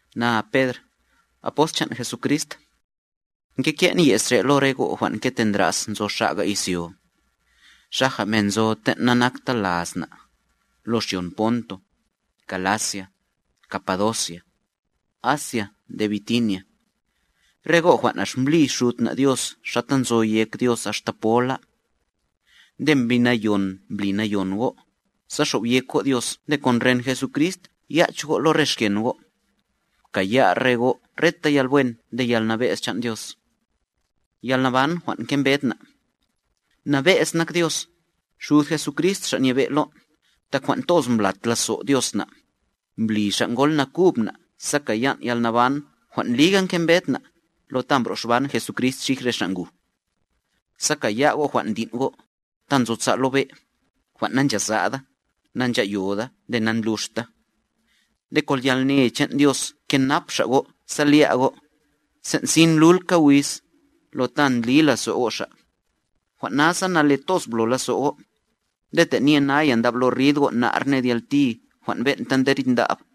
Na Pedr, apost chan' Jesucrist. Ngeke'n ye's re' lo re go' jwan' ngetendra's nzo xa'ga izyo, xaja men nzo ten' nanakta laz na', lo xyon Ponto, Galacia, Capadocia, Asia nde Bitinia. Re go' jwan' ax mblí Xud na' Dios xata nzo yek Dios axta pola. Nde Mbi Nayon mbli nayon go', sa xobyek go' Dios nde kon ren Jesucrist yach go' lo re xken go'. Pkaya' re go' reta yalwen nde yalnabe'z chan' Dios. Yalnaban jwan' ngembed na' Nabe'z nak Dios, Xud Jesucrist Xa' Nyebe' lon', tak jwan' toz mblat lazo' Dios na', mbli Xa' ngol nakub na' sa kayan' yalnaban jwan' liga ngembed na', lo ta mbro'xban Jesucrist xij re xa' nguj. Sa kaya' go' jwan' ndin' go', ta nzosa' lo be', jwan' nanchasa'da, nancha'yoda nde nandluxta. Nde kon yalne chan' Dios nkenap Xa' go' sa lya' go', sen' sin lulka wiz, lo ta ndli lazo' go' Xa'. Jwan' nasa nale toz blo lazo' go', nde tenye naya ndablo rid go' nar ned yalti jwan' ben'ta nde rid ndab,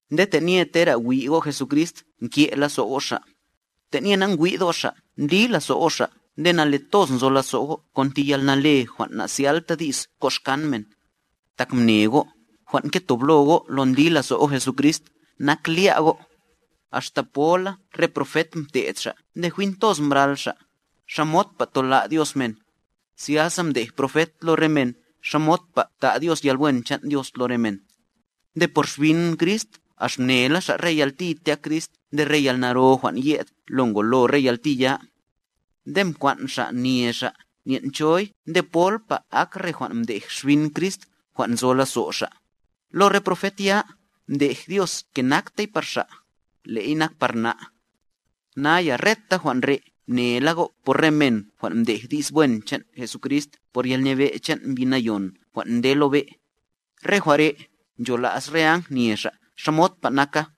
Nde tenye tera wi' go' Jesucrist nke' lazo' go' Xa'. Tenye nangwi'd go' Xa' ndli lazo' go' Xa' nde nale toz nzo lazo' go' kon ti yalnale jwan' na'zyalta di's koxkan men. Tak mne go', jwan' ngetoblo go' lo ndli lazo' go' Jesucrist, nak lya' go'. Axta pola re profet mte'd xa' nde jwin toz mbral xa', xamodpa tola' Dios men, zyasa mdej profet lo re men xamodpa ta' Dios yalwen chan' Dios lo re men. Nde por Xbin Crist ax mnela xa' re yalti tyak Crist nde re yalnaro jwan' ye'd lo ngolo re yalti ya. Nde mkwan' xa' nye xa' nyen' choy nde polpa ak re jwan' mdej Xbin Crist jwan' nzo lazo' xa'. Lo re profet ya, mdej Dios ke naktey par xa', le'y nak par na'. Naya reta jwan' re' mnela go' por re men jwan' ndej di's wen chan' Jesucrist por yalnibe' chan' Mbi Nayon jwan' nde lo be'. Re jwan' re', nchola's re áng nye xa' xamodpa naka.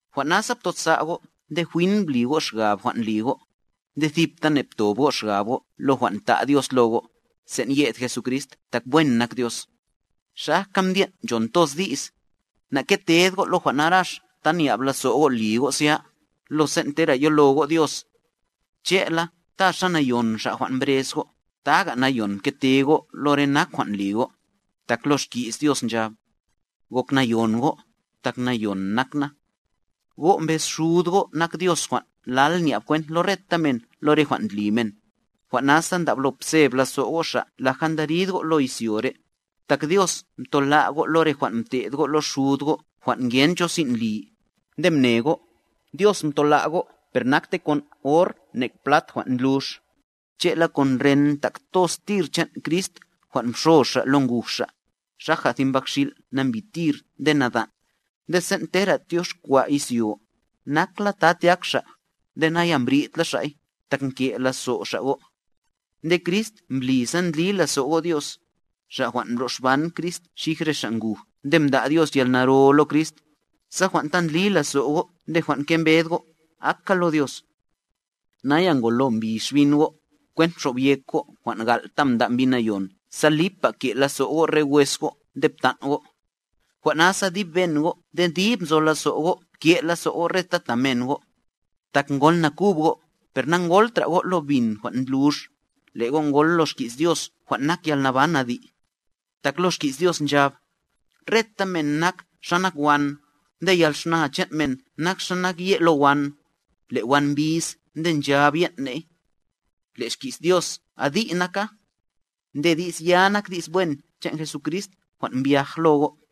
Jwan' nasa ptosa' go' nde jwin bli go' xgab jwan' li go'. Nde thiptane ptob go' xgab go' lo jwan' ta' Dios lo go', sen' ye'd Jesucrist tak wen nak Dios. Xajka mdyen' nchon toz di's, na'keted go' lo jwan narax ta nya'b lazo' go' ndli go' zya, lo sen' tera yolo go' Dios. Che'la, ta xa nayon Xa' jwan' mbrez go', taga nayon pkete go' lo re nak jwan' li go'. Tak lo Xki's Dios nchab: “Gok nayon go', tak nayon nak Na.” Go' mbez Xud go' nak Dios jwan' lal nya'b kwent lo reta men lo re jwan' ndli men, jwan' nasa ndablo pseb lazo' go' Xa' laja ndarid go' lo izyo re'. Tak Dios mtola' go' lo re jwan' mte'd go' lo xud go' jwan' ngen cho sin' li, nde mne go', Dios mtola' go' per nakte kon or nek plat jwan' ndlux, che'la kon ren ntak toz tir chan' Crist jwan' mxo Xa' lo nguj Xa', xaja thi mbakxil' nambi tir nde nadan'. Nde sen' tera tyoxkwa' izyo, nakla ta tyak Xa', nde naya mbridla Xa'y, tak nke' lazo' Xa' go'. Nde Crist mbli sa ndli lazo' go' Dios, Xa' jwan' mblo'xban Crist xij re xa' nguj nde mda' Dios yalnaro lo Crist, sa jwan' ta ndli lazo' go' nde jwan' nkembed go', aka lo Dios. Naya ngolo mbi xbin go', kwent mxobyek go' jwan' gal' ta nda' Mbi Nayon sa lipa ke' lazo' go' re wes go' nde ptan' go'. Jwan' nasa dib ben go' nde dib nzo lazo go' pke' lazo go' reta ta men go'. Tak ngol nakub go', per nangoltra go' lo bin jwan' ndlux, le' go' ngol lo xki's Dios jwan' nak yalnaban adi'. Tak lo Xki's Dios nchab: Reta men nak xa nak wan, nde yalxna chan' men nak xa nak ye' lo wan. Le' wan mbis nde nchab yen' ney. Le' xki's Dios adi' naka. Nde di's ya nak di's wen chan' Jesucrist jwan' mbyaj lo go'.